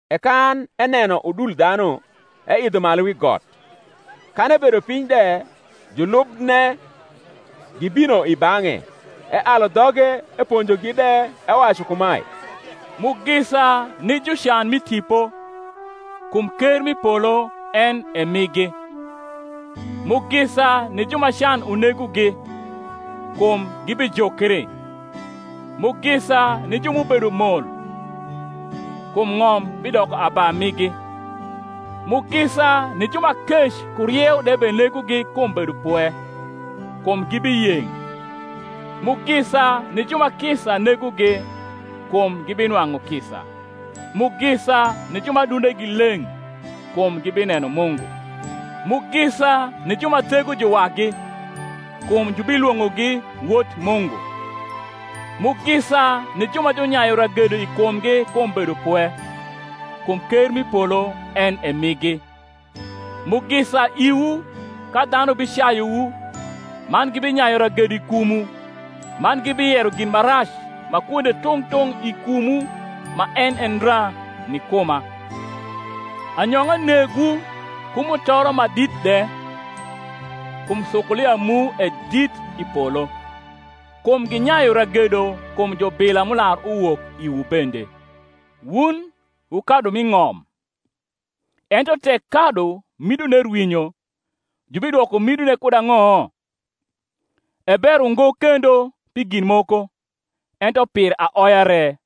E kan eneno udul dhanu, eidho malu wi got: kan ebedo piny de, julubne gibino i bang’e: ealu dhoge eponjogi de, ewacu kumae: Mugisa ni jucan mi tipo: kum ker m’i polo en e migi. Mugisa ni ju ma can unegogi: kum gibijukri. Mugisa ni ju m’ubedo mol: kum ng’om bidoko aba migi. Mugisa ni ju ma kec ku rieu de benegogi kum bedopwe: kum gibiyeng’. Mugisa ni ju ma kisa negogi: kum gibinwang’u kisa. Mugisa ni ju ma adundegi leng’: kum gibineno Mungu. Mugisa ni ju ma thego juwagi: kum jubilwong’ogi wot Mungu. Mugisa ni ju ma junyayu ragedo i kumgi kum bedopwe: kum ker m’i polo en e migi. Mugisa iwu ka dhanu bicayuwu, man gibinyayu ragedo i kumwu, man gibiyero gin ma rac ma kwonde tung’ tung’ i kumwu ma en e ndra, ni kuma. Anyong’a negwu, ku mutoro ma dit de: kum sukulia mu e dit i polo: kum ginyayu ragedo kum jubila m’ular uwok iwu bende. Wun wu kadu m’i ng’om: ento tek kadu midone rwinyo, jubidwoko midone kud ang’o? e ber ungo kendo pi gin moko, ento pir aoya re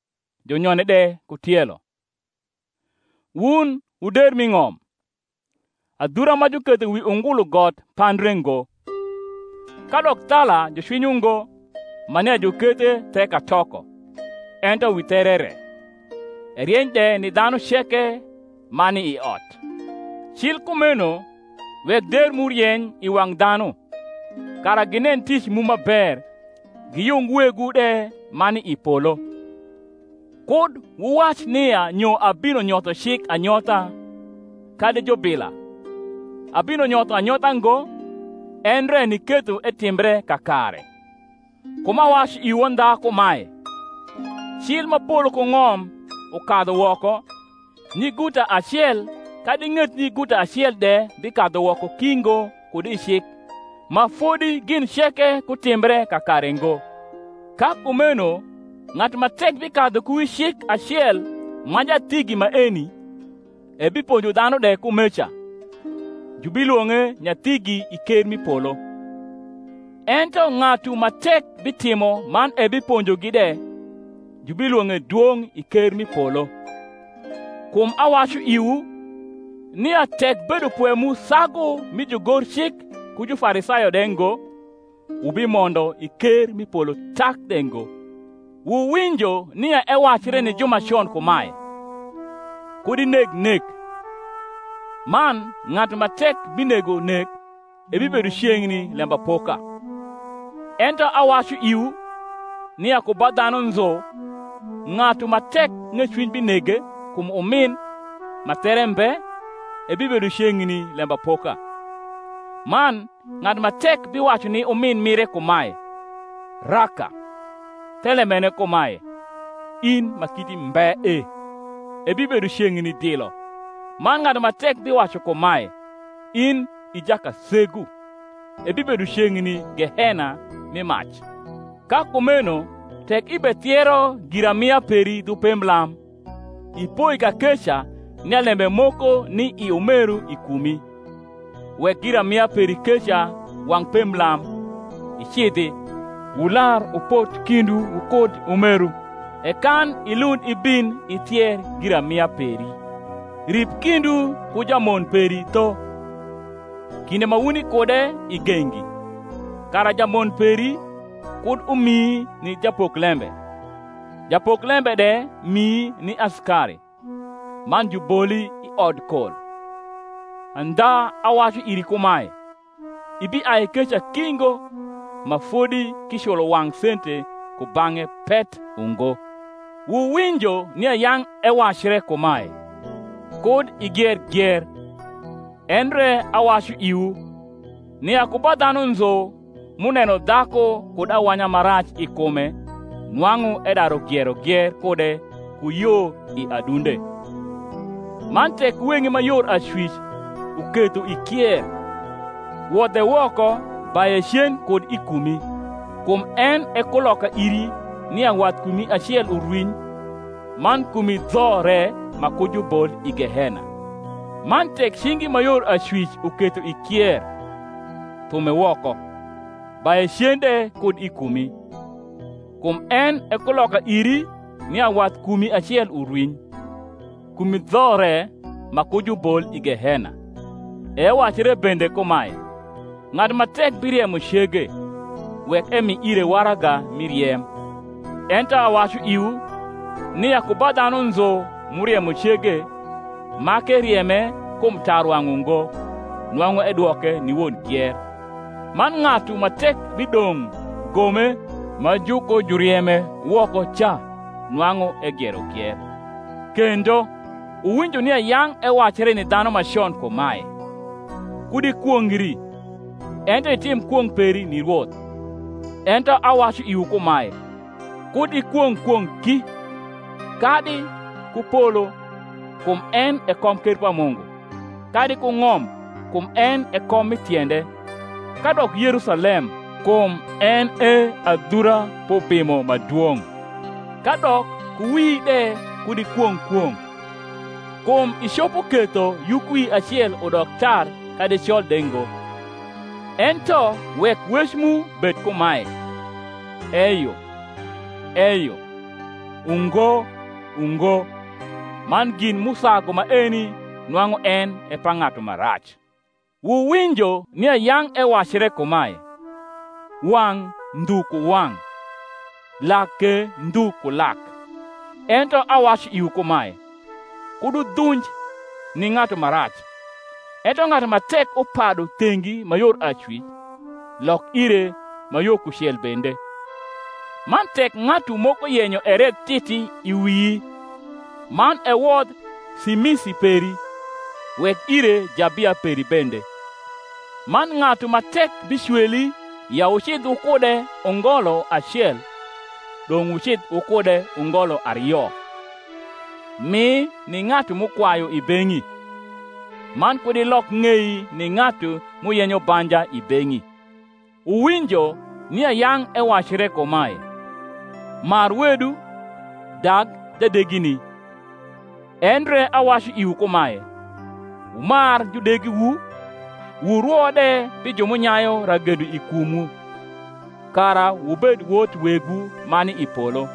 junyone de ku tielo. Wun wu der m’i ng’om. Adhura ma juketho wi ungulu got pandre ngo. Kadok thala jucwinyo ngo, ma nia jukethe the katoko, ento wi there re; erieny de ni dhanu ceke ma ni i ot. Cil kumeno wek der mu urieny i wang’ dhanu; kara ginen tic mu ma ber, giyung Wegwu de ma ni i polo. Kud wuwac nia nyo abino nyotho cik anyotha kadi jubila: abino nyotho anyotha ngo, endre niketho etimbre kakare. Kum awacu iwu andha kumae, Cil ma polo ku ng’om ukadhu woko, nyiguta acel kadi ng’et nyiguta acel de bikadhu woko ki ngo kud i cik, ma fodi gin ceke kutimbre kakare ngo. Ka kumeno ng’atu ma tek bikadhu ku wi cik acel ma nyathigi maeni, ebiponjo dhanu de kumeca, jubilwong’e nyathigi i ker m’i polo: ento ng’atu ma tek bitimo man ebiponjogi de, jubilwong’e dwong’ i ker m’i polo. Kum awacu iwu, nia tek bedopwe mu sagu mi jugorcik ku Jufarisayo de ngo, wubimondo i ker m’i polo tak de ngo. Wuwinjo nia ewacre ni ju ma con kumae, Kud ineg nek; man ng’atu ma tek binego nek ebibedo ceng’ni lembapoka: ento awacu iwu, nia ku ba dhanu nzu ng’atu ma tek ng’ecwiny binege kum umin ma there mbe ebibedo ceng’ni lembapoka; man ng’atu ma tek biwacu ni umin mire kumae, Raka, thelembene kumae, In ma kiti mbe e, ebibedo ceng’ni dilo; man ng’atu ma tek biwacu kumae, In i jakasegu, ebibedo ceng’ni gehena mi mac. Ka kumeno tek ibethiero giramia peri dhu pemblam, ipoi kakeca nia lembe moko ni i umeru i kumi, wek giramia peri keca wang’ pemblam, icidhi, wular wupot kindwu wukud umeru, e kan ilund ibin ithier giramia peri. Rip kindwu ku jamon peri tho, kinde ma wuni kude i gengi; kara jamon peri kud umii ni japoklembe, japoklembe de mii ni asikari, man juboli i odkol. Andha awacu iri kumae, Ibiai keca ki ngo, ma fodi k’iculo wang’ sente kubang’e pet ungo. Wuwinjo nia yang’ ewacre kumae, Kud igier gier: endre awacu iwu, nia ku ba dhanu nzu m’uneno dhaku kud awanya ma rac i kume nwang’u edaru giero gier kude ku yo i adunde. Man tek weng’i ma yor acwic uketho ikier, wodhe woko, baye cen kud i kumi: kum en e kuloka iri nia wathkumi acel urwiny, man kumi dho re ma ku jubol i gehena. Man tek cingi ma yor acwic uketho ikier, thume woko, baye cen de kud i kumi: kum en e kuloka iri nia wathkumi acel urwiny, kumi dho re ma ku jubol i gehena. E ewacre bende kumae, Ng’atu ma tek biriemo cege, wek emi ire waraga mi riem: ento awacu iwu, nia ku ba dhanu nzu m’uriemo cege, ma k’erieme kum tarwang’ ungo, nwang’u edwoke ni won gier: man ng’atu ma tek bidong’ gome ma jukojurieme woko ca nwang’u egiero gier. Kendo, wuwinjo nia yang’ ewacre ni dhanu ma con kumae, Kud ikwongri, ento itim kwong’ peri ni Rwoth: ento awacu iwu kumae, Kud ikwong’ kwong’ ki; kadi ku polo, kum en e komker pa Mungu; kadi ku ng’om, kum en e kom mi tiende; kadok Yerusalem, kum en e adhura p’Ubimo ma dwong’. Kadok ku wii de kud ikwong’ kwong’, kum icopo ketho yukwii acel udok tar kadi col de ngo. Ento wek wec mu bed kumae, Eyo, eyo; Ungo, ungo; man gin m’usagu maeni nwang’u en e pa ng’atu ma rac. Wuwinjo nia yang’ ewacre kumae, Wang’ ndhu ku wang’, lak ke ndhu ku lak; ento awacu iwu kumae, Kud wudhunj ni ng’atu ma rac: ento ng’atu ma tek upadu thengi ma yor acwic, lok ire ma yo kucel bende. Man tek ng’atu moko yenyo eredh titi i wii, man ewodh simisi peri, wek ire jabia peri bende. Man ng’atu ma tek bicweli ya wucidh wukude ungolo acel, dong’ wucidh wukude ungolo ario. Mi ni ng’atu m’ukwayu i beng’i, man, kud ilok ng’ei ni ng’atu m’uyenyo banja i beng’i. Wuwinjo nia yang’ ewacre kumae, Mar wedu, dag jadegini: endre awacu iwu kumae, Wumar judegiwu, wurwo de pi ju m’unyayu ragedo i kumwu; kara wubed wot Wegwu ma ni i polo: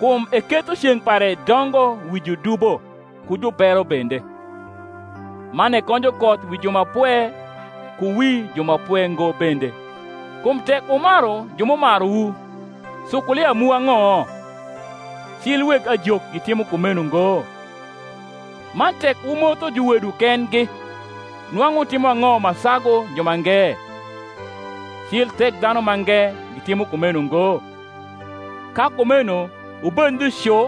kum eketho ceng’ pare dongo wi judubo ku jubero bende, man ekonjo koth wi ju ma pwe ku wi ju ma pwe ngo bende. Kum tek wumaru ju m’umaruwu, sukulia mu ang’o? cil weg ajok gitimo kumeno ngo? Man tek wumotho juwedwu kendgi, nwang’u wutimo ang’o ma sagu jumange? cil Thekdhanumange gitimo kumeno ngo? Ka kumeno wubed ndhu cu,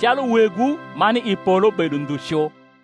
calu Wegwu ma ni i polo bedo ndhu cu.